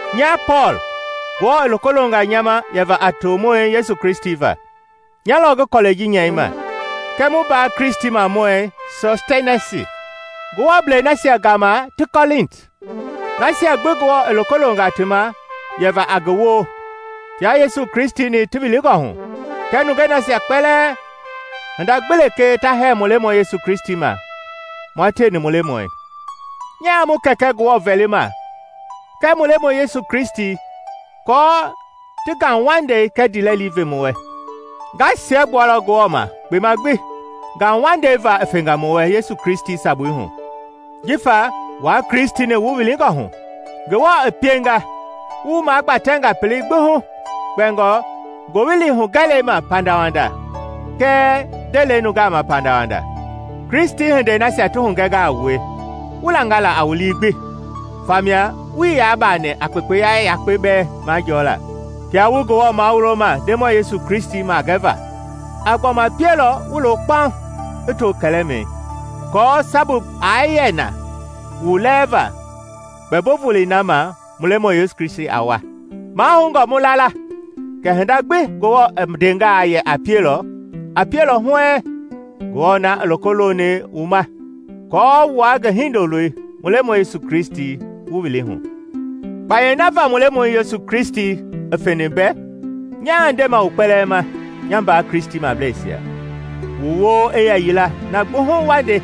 Nya Pɔɔl, Ngewɔ i loko longa nya ma yɛva a tomɔi Yesu Kristi va, nya lɔ ngi kɔlɛi ji nyɛima, kɛɛ mu mbaa Kristimɔi Sɔstɛnisi, Ngewɔblei nasia gama ti Kɔlinti, nasia gbi Ngewɔ i loko longa ti ma yɛva a ngi woo, tia Yesu Kristi-ni ti wilingɔ hu, kɛɛ nungei nasia kpɛlɛɛ hinda gbi lekee ta hɛɛ mu Lemɔi Yesu Kristi ma, mua tieni mu Lemɔi. Nyaa mu Kɛkɛ Ngewɔ vɛlima kɛɛ mu Lemɔi Yesu Kristi aako i ti Ngauwandei kɛɛ ndiilɛli ve wu wɛ. Nga siɛgbualɔ Ngewɔ ma kpema gbi ngauwandei va i fɛnga wu wɛ Yesu Kristi sabui hu. Jifa wua Kristi-ni wu wilingɔ hu, Ngewɔ i pienga wu magbatɛnga pelei gbi hu kpɛngɔ ngowili hugɛlɛi ma pandawanda kɛɛ ndelei nungaa ma pandawanda. Kristi hindei nasia ti hugɛnga a wue, wu langa la a wu lii gbi famia wuii yaa baani a kpekpeya yakpe bɛɛ majɔɔla, kia wu Ngewɔ mawuloma Ndemɔi Yesu Kristi magɛva. A gbɔma pielɔ wu loo kpauŋ i to kɛlɛmɛi, aako sabu gbi aa yɛ na wu lɛɛva Kpɛmbo Volei na ma mu Lemɔi Yesu Kristi a wa. Mahoungɔ mu la la kɛ hinda gbi Ngewɔ i ndengaa yɛ a pielɔ, a pielɔ huɛɛŋ, Ngewɔ na i loko loni wu ma aako wua ngi Hindoloi, mu Lemɔi Yesu Kristi wu wili hu. Kpayei na va mu Lemɔi Yesu Kristi i feni mbɛ, nyaa ndema wu kpɛlɛɛ ma, nya mbaa Kristimableisia, wu woo i yɛ yila na gbi hu wa nde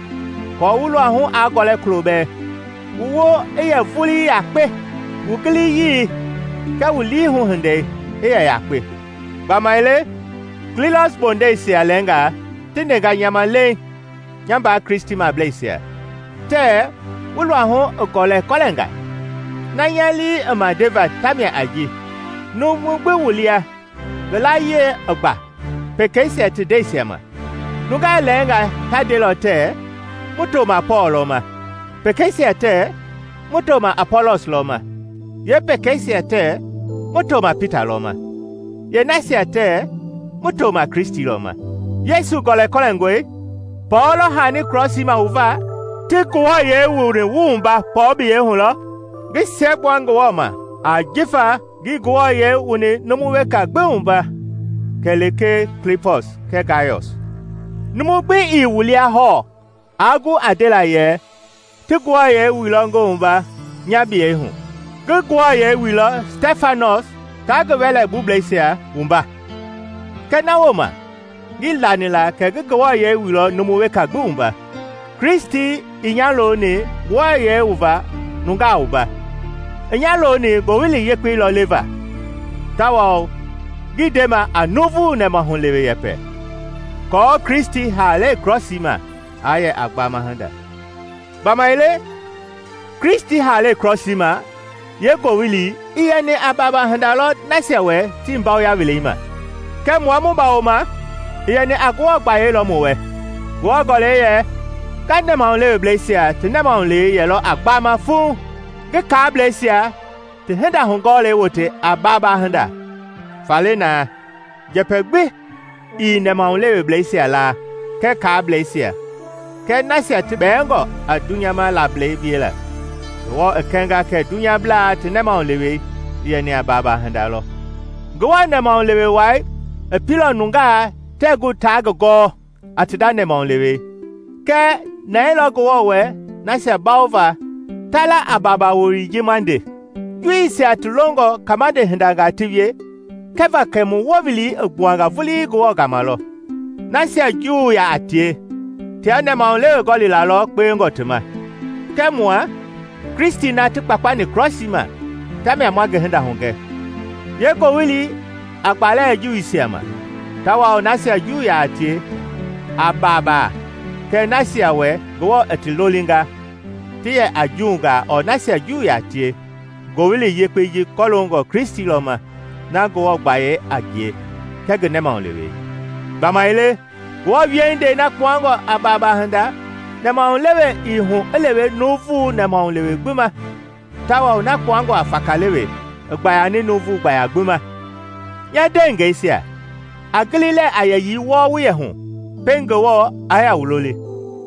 aako wu luahu aa gɔlɛ kulo bɛɛ. Wu woo i yɛ vulii yakpe, wu giliyii kɛɛ wu lii-hu-hindei i yɛ yakpe. Gbamaile Kloi bondɛisia lɛɛngaa ti ndenga nya ma leiŋ nya mbaa Kristimableisia, tɛɛ wu luahu i gɔlɛkɔlɛnga. Na nya lii i ma ndeva tamia a ji numu gbi wu lia ngi layie i gba pekeisia ti ndeisia ma. Nungaa lɛɛngaa ta ndelɔ tɛɛ, “Mu toma Pɔɔl lɔ ma;” pekeisia tɛɛ, “Mu toma Apɔlɔs lɔ ma”; yeepekeisia tɛɛ, “Mu toma Pita lɔ ma;” yeenasia tɛɛ, “Mu toma Kristi lɔ ma.” Yesu gɔlɛkɔlɛngɔe? Pɔɔl lɔ haani Krɔsii ma wu va? Ti wu wuani a Ngewɔ yei Pɔɔl biyei hu lɔ? Ngi siɛgbua Ngewɔ ma jifa ngii numu weka gbi wuani a Ngewɔ yei kɛlee Klipɔsi kɛɛ Gayɔs. Numu gbi ii wu lia hɔɔ aa gu a ndela yɛ ti ngi wuailɔ a Ngewɔ yei nya biyei hu. (Ngi Stɛfanɔs taa ngi wɛlɛbubleisia bɛɛ wuailɔ kɛɛ na wooma ngii lani la kɛ ngi numu weka gbi wuailɔ.) Kristi ii nya looni nungaa wuava. I nya looni Ngowili Yekpei lɔ leva, tawao ngii ndema a nuuvu nɛmahulewe yɛpɛ, aako Kristi haalei krɔsii ma aa yɛ a gbama hinda. Gbamaile Kristi haalei krɔsii ma yeengowili i yɛni a baaba hinda lɔ nasia wɛ tii mbawoya weleima; kɛɛ mua mu bawoma, i yɛni a Ngewɔ gbayei lɔ mu wɛ. Ngewɔ Gɔlɛi yɛ, “Nga nɛmahuleweblɛisia ti nɛmahulewei yɛlɔ a gbama fuŋ, ngi kaableisia ti hinda hugɔɔlei wote a baaba hinda.” Faale naa, njɛpɛ gbi ii nɛmahuleweblɛisia la kɛɛ kaableisia kɛɛ nasia ti bɛɛngɔ a dunyama laablɛi wiela. Ngewɔ i kɛnga kɛ dunyablaa ti nɛmahulewei i yɛni a baabaa hinda lɔ! Ngewɔ nɛmahulewe wai i pieilɔ nungaa tɛɛ gu taa ngi gɔɔ a ti nda nɛmahulewe. Kɛɛ nɛɛilɔ Ngewɔ wɛ nasia bawova ta la a “Baaba” wowili ji ma nde. Juuisia ti longɔ kabande hindanga ti wie kɛva kɛ mu wowili i gbuanga vulii Ngewɔ gama lɔ. Nasia Juu yaa tie tia nɛmahulewe gɔlila lɔ kpewengɔ ti ma. Kɛɛ mua, Kristi na ti kpakpani krɔsii ma tamia ma ngi hinda hugɛ, yeengowili a gbalɛ Juuisia ma, tawao nasia Juu yaa tie a babaa; kɛɛ nasia wɛ Ngewɔ i ti lolinga, ti yɛ a Juungaa ɔɔ nasia Juu yaa tie, Ngowili Yekpei ji kɔloongɔ Kristi lɔ ma, na Ngewɔ gbayei a ngie kɛɛ ngi nɛmahulewei. Gbamaile Ngewɔ wiehindei na kpuangɔ a baaba hinda, nɛmahulewe i hu i lewe nuuvu nɛmahulewe gbi ma tawao na kpuangɔ a faakaalewe i gbayani nuuvu gbaya gbi ma. Nya ndeengɛisia, a gili lɛɛ a yɛyii wɔɔ wu yɛ hu pɛiŋ Ngewɔ i wu loli.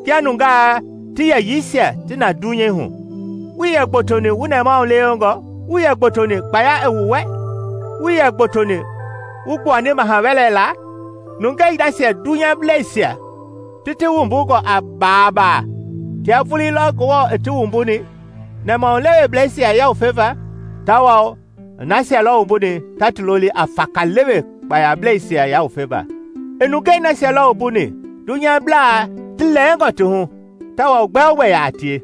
Kia nungaa ti yɛyiisia ti na dunyei hu, wuii yɛ gbotoni wu nɛmahulewengɔ, wuii yɛ gbotoni kpaya i wu wɛ, wuii yɛ gbotoni wu gbuani maha wɛlɛ laa. Nungɛi nasia dunyableisia ti ti wumbungɔ a baabaa, tia vulii lɔ Ngewɔ i ti wumbuni, nɛmahuleweblɛisia yawufeva, tawao i nasia lɔ wumbuni ta ti loli a faakaalewe kpayableisia yawufeva. I nungei nasia lɔ wumbuni dunyablaa ti lɛɛngɔ ti hu tawao gbɛogbɛ yaa a tie,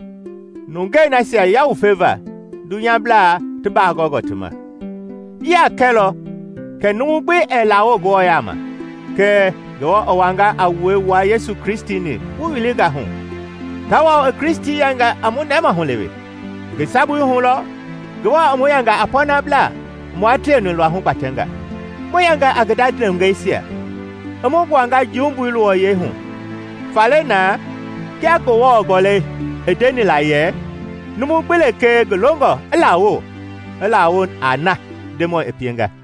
nungei nasia yawufeva dunyablaa ti baa gɔngɔ ti ma. Ji a kɛlɔ kɛ numu gbi ɛɛ lawo Ngewɔ yaama. Kɛɛ Ngewɔ i wanga a wue wua Yesu Kristi-ni wu wilinga hu, tawao i Kristi yɛnga a mu nɛmahulewe. Ngi sabui hu lɔ Ngewɔ i mu yɛnga a pɔnablaa i mua tieni luahu gbatɛnga, mu yɛnga a ngi nda nungeisia, i mu gbuanga jumbui luwɔyɛi hu. Faale naa, kia Ngewɔ Gɔlɛi i ndeni la yɛ, “Numu gbi lekee ngi longɔ i lawo, i lawo a na Ndemɔi i pienga.”